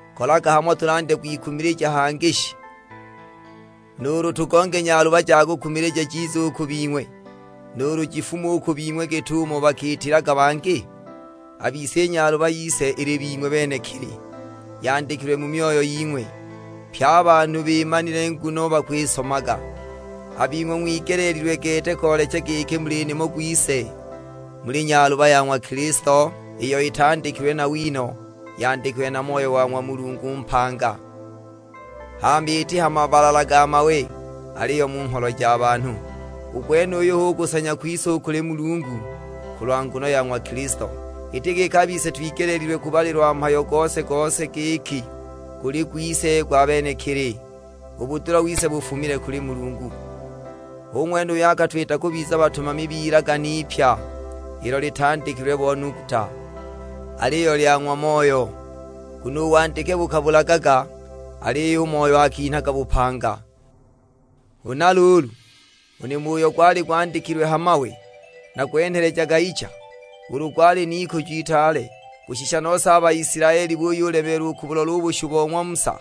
Kolaga hamo tulandya kwikumilija hangi shi? Nuulu tugonge nyaluba ja kukumilija jize u ku bing'we, nuulu jifume u ku bing'we, git'umo bakiitilaga bangi? A bise i nyaluba yise ili bing'we benekili; yandikilwe mu myoyo ying'we, pye a banhu bimanile nguno bakwisomaga. A bing'we ng'wigeleelilwe gete koolecha giki muli nimo gwise, muli nyaluba ya ng'wa Kilisto iyo itandikilwe na wino, yandikilwe na Moyo wa ng'wa Mulungu mpanga, hama iti ha mabalala ga mawe, aliyo mu ngholo ja banhu. U gwenuyu hu kusanya kwise u kuli Mulungu, kulwa nguno ya ng'wa Kilisto. Iti giki a bise twigeleelilwe kubalilwa mhayo gose-gose giki guli gwise gwa benekili; u budula wise bufumile kuli Mulungu. Hu ng'wene uyo akatwita kubiza batumami b'ilagane ipya, ilo litandikilwe bo nuguta, aliyo lya ng'wa Moyo; nguno u wandike bukabulagaga, aliyo u Moyo akinhaga bupanga. Huna luulu, u nimo uyo gwali gwandikilwe ha mawe na gwenhelejaga icha, ulu gwali n'ikujo itaale, kushisha nose a Baisilaeli buyulemeelwa u kubulola u bushu bo ng'wa Musa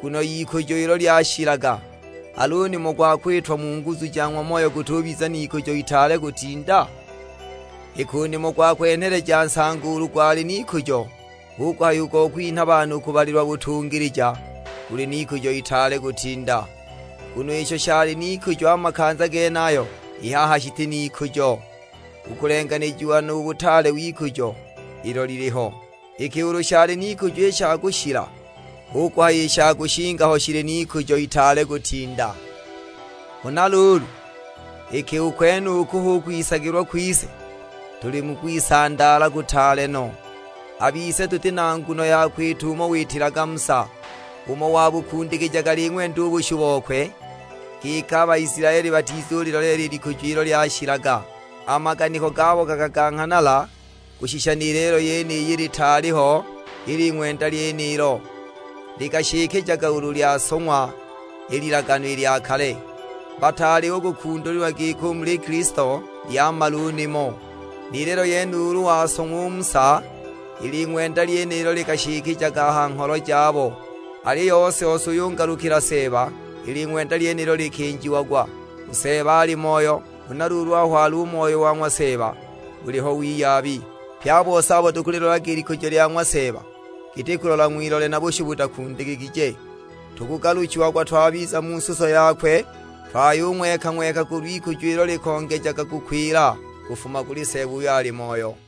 nguno y'ikujo ilo lyashilaga, al'u nimo gwa kwitwa mu nguzu ja ng'wa Moyo gutubiza n'ikujo itaale kutinda? Iki u nimo gwa kwenheleja nsango ulu gwali n'ikujo, hu kuhaya u gwa kwinha banhu kubalilwa butungilija guli n'ikujo itaale kutinda! Nguno isho shali n'ikujo a makanza genayo, i haha shiti n'ikujo, u kulenganijiwa nu butaale w'ikujo ilo liliho! Iki ulu shali n'ikujo i sha kushila, hu kuhaya i sha kushinga ho shili n'ikujo itaale kutinda! Huna luulu, iki u kwenuku hu kwisagilwa kwise, tuli mu kwisandaala kutaale no. A bise tuti na nguno ya kwita umo witilaga Musa, umo wabukundikijaga ling'wenda u bushu bokwe, giki a Baisilaeli batizuliiloleela i likujo ilo lyashilaga. A maganiko gabo gakaganghanala, kushisha ni lelo yeniyi litaali ho i ling'wenda lyenilo, likashikijaga ulu lyasong'wa i Lilagano lya Kale. Bataali u kukundulilwa giki u muli Kilisto lyamala u nimo. Ni lelo yene ulu wasong'wa u Musa i ling'wenda lyenilo likashikijaga a ha ngholo jabo. Aliyo ose-ose uyo ungalukila Seeba, i ling'wenda lyenilo likinjiagwa U Seeba ali Moyo, huna luulu aho ali u Moyo wa ng'wa Seeba, buliho wiyabi. Pye a bise abo tukulilolaga i likujo lya ng'wa Seeba giti kulola ng'wilole na bushu butakundikigije, tukugaluchiagwa twabiza mu suso yakwe, twayung'weka-ng'weka kulw'ikujo ilo likongejaga kukwila, kufuma kuli Seeba uyo ali Moyo.